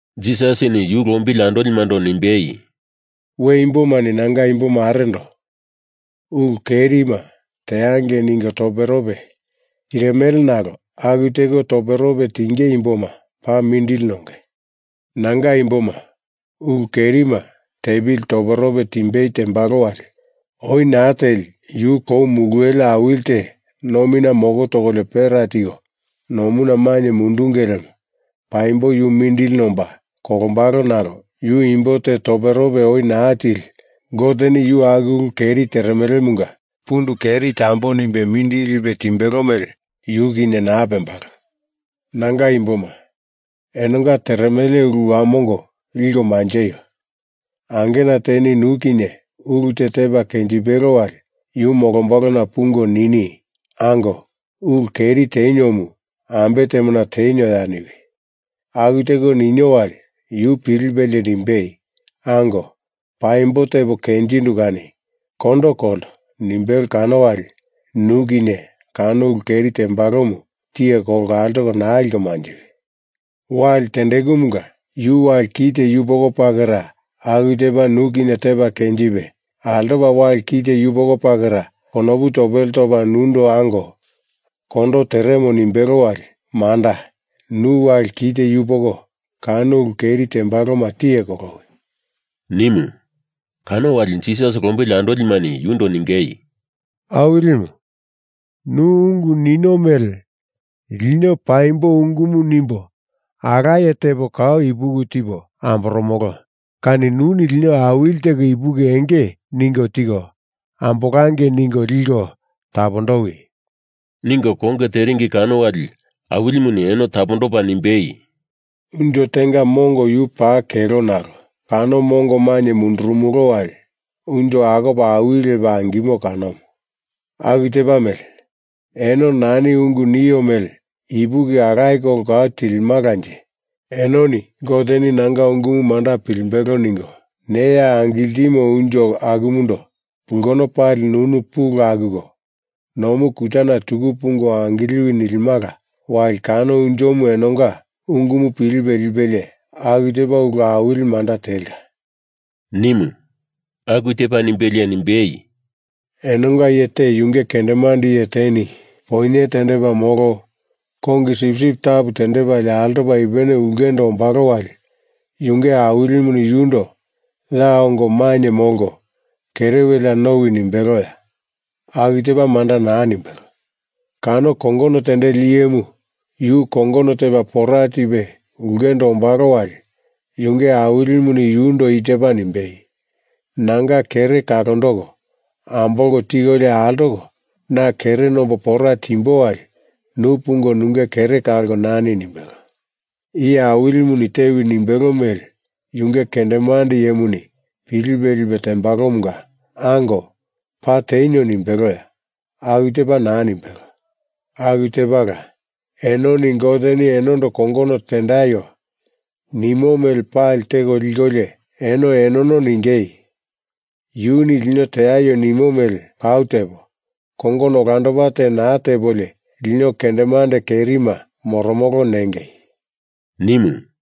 Jisasini yu lombili andolimando nimbei, “We imbomani nanga imbomarendo Ulu kerima teangei ningo toperope tirimele nalo aku teko toperope tinge imboma paa mindili nonge. Nanga imboma ulu kerima tepili toperope timbei tembalo wali oi naa teli yu kou muluwele awili te nomina moko tokolio pera tiko nomuna mainye mundunge lemo paimbo yu mindili nomba kolombalo nalo yu imbo te toperope oi naa tili Goteni yu aku ulu keri teremelemunga pundu keri tambo nimbe mindili lipe timbelo mele yu kinye naa pembalo. Nanga imboma, enonga teremele ulu wamongo liko manjeio! Angena teni nu kinye ulu te tepa kenjimbelo wali yu molombalona pungo nini, ‘Ango, ulu keri teniomu, ambe temona tenioya?’ niwi! Aku teko ninio wali yu pilipelie nimbei, ‘Ango, paimbo tepo kenjindu kani kondo kolto’ nimbelo kano wali nu kinye kano ulu keri tembalomu tiye kolko altoko naa liko manjiwi. Wali tendekumunga yu wali ki te yupoko pakera aku tepa nu kinye tepa kenjipe, altopa wali ki te yupoko pakera konopu topele topa nundo ango, kondo teremo nimbelo wali manda, nu wali ki te yupoko kano ulu keri tembaloma tiye kolowi,” nimu. Kano wali Jisas lombili andolimani yundo ningei, “Awilimu, nu ungu nino mele lino paimbo ungumu nimbo alaye tepo kau ipuki tipo amboromolo kani nuni awili teko ipuki enge ningo tiko ambolangei ningo liko tapondowi,” ningo konge teringi kano wali Awilimuni eno topondopa nimbei, “Unjo tenga mongo yu paa kelo nalo kano mongo maina mundurumolo wali unjo akopa awili lepa angimo kanomu. Aku tepa mele, eno nani ungu nio mele ipuki alaye kolo kau tilimalanje, enoni Goteni nanga ungumu manda pilimbelo ningo neya angiltimo unjo akumundo pulkono pali nunu pulu akuko, nomu kutana tuku pungo angiliwi nilimala wali kano unjomu enonga ungumu pilipe lipelie aku tepa ulu awili manda telka,” nimu. Aku tepa nimbelie nimbei, “Enonga iye te yunge kendemande iye teni poinye tendepa molo kongi sipsip tapu tendepalie altopa ipupene ulkendo ombalo wali yunge awilimuni yundo ya ongo mainye molko kere welea nowi nimbeloya? Aku tepa manda naa nimbelo. Kano kongono tendeli iyemu yu kongono tepa pora tipe ulkendo ombalo wali yunge awilimuni yundo i tepa nimbei, ‘Nanga kere kalondoko ambolko tikolio altoko na kere nombo pora timbo wali nu pungo nunge kere kalko nani,’ nimbelo. Iye awilimuni tewi nimbelo mele yunge kendemande iyemuni pilipe lipe tembalomunga, ‘Ango, paa tenio,’ nimbeloya? Aku tepa naa nimbelo. Aku tepala, enoni Goteni enondo kongono tendaio nimo mele pali teko likolio eno enono ningei, yuni lino teaio nimo mele kau tepo, kongono olandopa te naa tepolio lino kendemande kerima moromolo nengei,” nimu.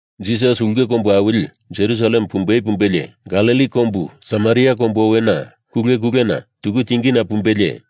Jisas ulke kombu awili Jerusalem pumbei pumbelie, Galili kombu Samaria kombu owena kule kulena tuku tingina pumbelie,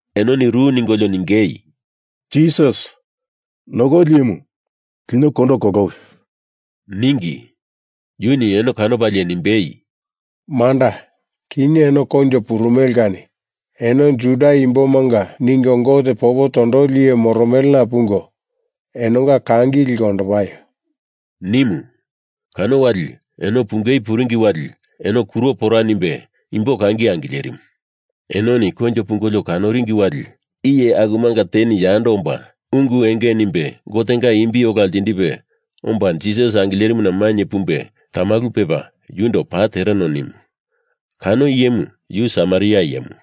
enoni ru ningolio ningei, “Jisas, Nokoli Iyemu, lino kondo kolowi,” ningi. Yuni eno kanopalie nimbei, “Manda, kinye eno koinjo purumele kani eno Juda Imbomanga ningo Gote popo tondoli iye moromelena pungo, enonga kangi liko ondopaio,” nimu. Kano wali eno pungei puringi wali eno kuro pora nimbe imbo kangi angilerimu. Enoni koinjo pungolio kanoringi wali iye akumanga teni yando omba ungu enge nimbe Gotenga imbi ola ltindipe omba Jisas angilerimuna mainye pumbe tamalu pepa yundo paa tereno nimu. Kano iyemu yu Samaria iyemu.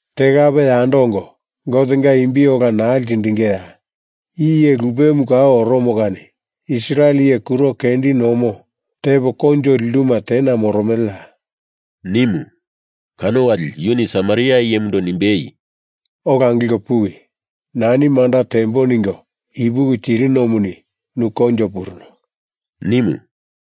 Te kape yando ongo, Gotenga imbi ola naa ltindingeya? I iye lupemu kau oromo kani Israel iye kuro kendi nomo tepo koinjo linduma tena moromeleya?” nimu. Kano wali yuni Samaria iyemundo nimbei, “Ola angilko puwi. Nani manda tembo ningo ipuki tirinomuni nu koinjo puruno,” nimu.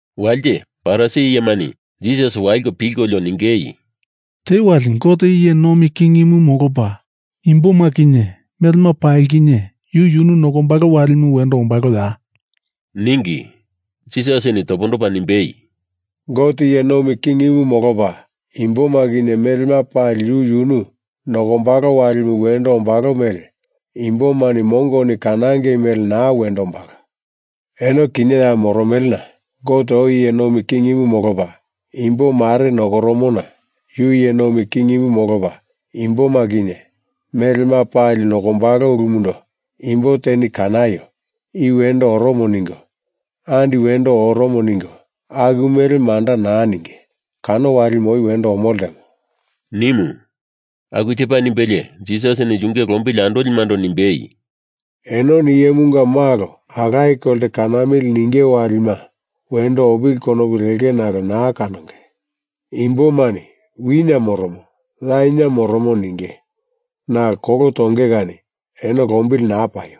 Walite Farisi iyemani Jisas waliko pilkolio ningei, “Te wali Gote iye nomi kingimu molopa imboma kinye melema pali kinye yu yunu nokombalo walimu wendo ombaloya?” ningi. Jisasini topondopa nimbei, “Gote iye nomi kingimu molopa imboma kinye melema pali yu yunu nokombalo walimu wendo ombalo mele imbomani mongoni kanangei mele naa wendo ombalo. Eno kinye ya moromelena Gote oi iye nomi kingimu molopa imbo mare nokoromona yu iye nomi kingimu molopa imboma kinye melema pali nokombalo ulumundo imbo teni kanaio, i wendo oromo ningo, andi wendo oromo ningo, aku mele manda naa ninge. Kano walimu oi wendo omo ltemo,” nimu. Aku tepa nimbelie Jisasini yunge lombili andolimando nimbei, “Enoni Iyemunga Malo alaye kolte kanamili ninge walima wendo opili konupu lenge nalo naa kanonge. Imbomani wina moromo, ya ina moromo ninge. Nalo kolo tonge kani eno lombili naa paio!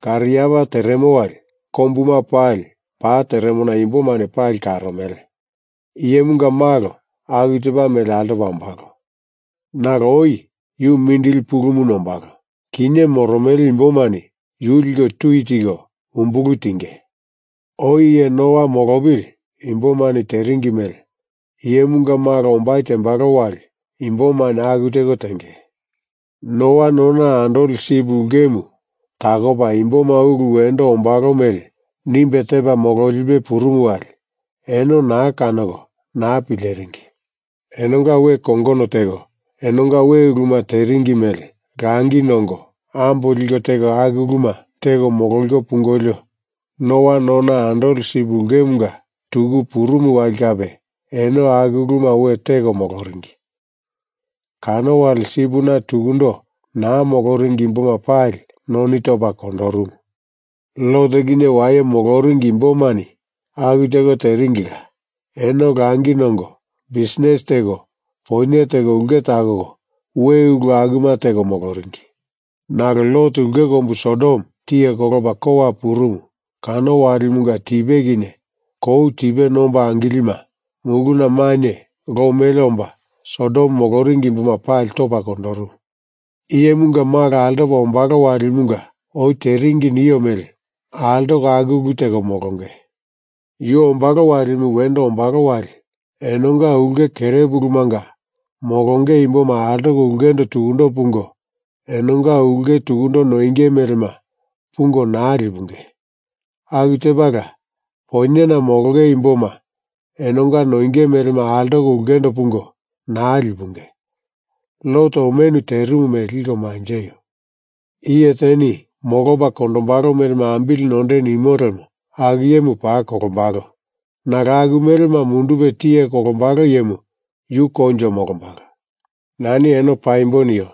Kariapa teremo wali kombuma pali pa teremona imbomani pali karomele. Iyemunga Malo aku tepa mele altopa ombalo. Nalo oi yu mindili pulumu nombalo, kinye moromele imbomani yu liko tui tiko umbulu tinge. Oi iye Noa molopili imbomani teringi mele Iyemunga Malo ombai tembalo wali imbomani aku teko tenge. Noa nona andoli sip ulkemu takopa imboma ulu wendo ombalo mele nimbe tepa mololipe purumu wali eno naa kanoko naa pileringi. Enonga we kongono teko enonga we uluma teringi mele langi nongo ambo liko teko aku uluma teko mololiko pungolio, Noa nona andoli sip ulkemunga tuku purumu wali kape eno aku uluma we teko moloringi. Kano wali sipina tukundo naa moloringi imboma pali noni topa kondorumu. Lot kinye waye moloringi imbomani aku teko teringila. Eno langi nongo bisnis teko poinye teko ulke takoko, we ulu akuma teko moloringi. Nalo Lot ulke kombu Sodom tiye kolopa kowa purumu kano walimunga tipe kinye kou tipe nomba angilima muluna mainye lo mele omba Sodom moloringi imboma pali topa kondorumu. Iyemunga Malo altopa ombalo walimunga oi teringi nio mele altoko aku ulu teko molonge. Yu ombalo walimu wendo ombalo wali enonga ulke kerepulumanga molonge imboma altoko ulkendo tukundo pungo enonga ulke tukundo noinge melema pungo naa lipunge! Aku tepala poinyena molonge imboma enonga noinge melema altoko ulkendo pungo naa lipunge! Lot omenu terimu mele liko manjeio! Iye teni molopa kondombalo melema ambili nonde nimo lemo aku iyemu paa kolombalo nalo aku melema mundupe tiye kolombalo iyemu yu koinjo molombalo. Nani eno paimbo nio.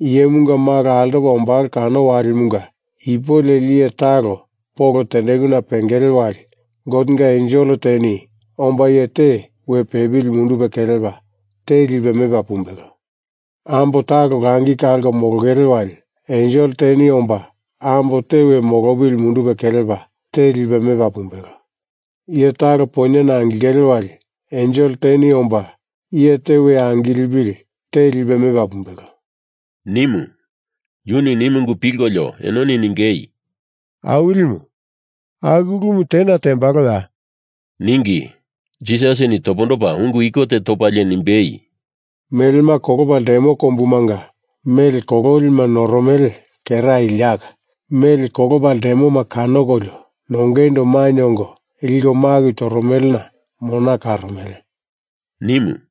Iyemunga Malo altopa ombalo kano walimunga ipu leli iye talo polo tendekuna pengele wali Gotenga ensel teni omba iye te we pepili mundupe kelepa te lipe mepa pumbelo. Ambo talo langi kalko molongele wali ensel teni omba ambo te we molopili mundupe kelepa te lipe mepa pumbelo. Iye talo poinyena angilingele wali ensel teni omba iye te we angilipili te lipe mepa pumbelo,” nimu. Yuni nimu ungu pilkolio enoni ningei, “Awilimu, aku ulumu tena tembaloya?” ningi. Jisasini topondopa ungu iko te topalie nimbei, “Melema kolopa ltemo kombumanga mele kololima noromele kera iliaka mele kolopa ltemoma kanokolio nongeindo mainye ongo liko maku toromelena mona karomele,” nimu.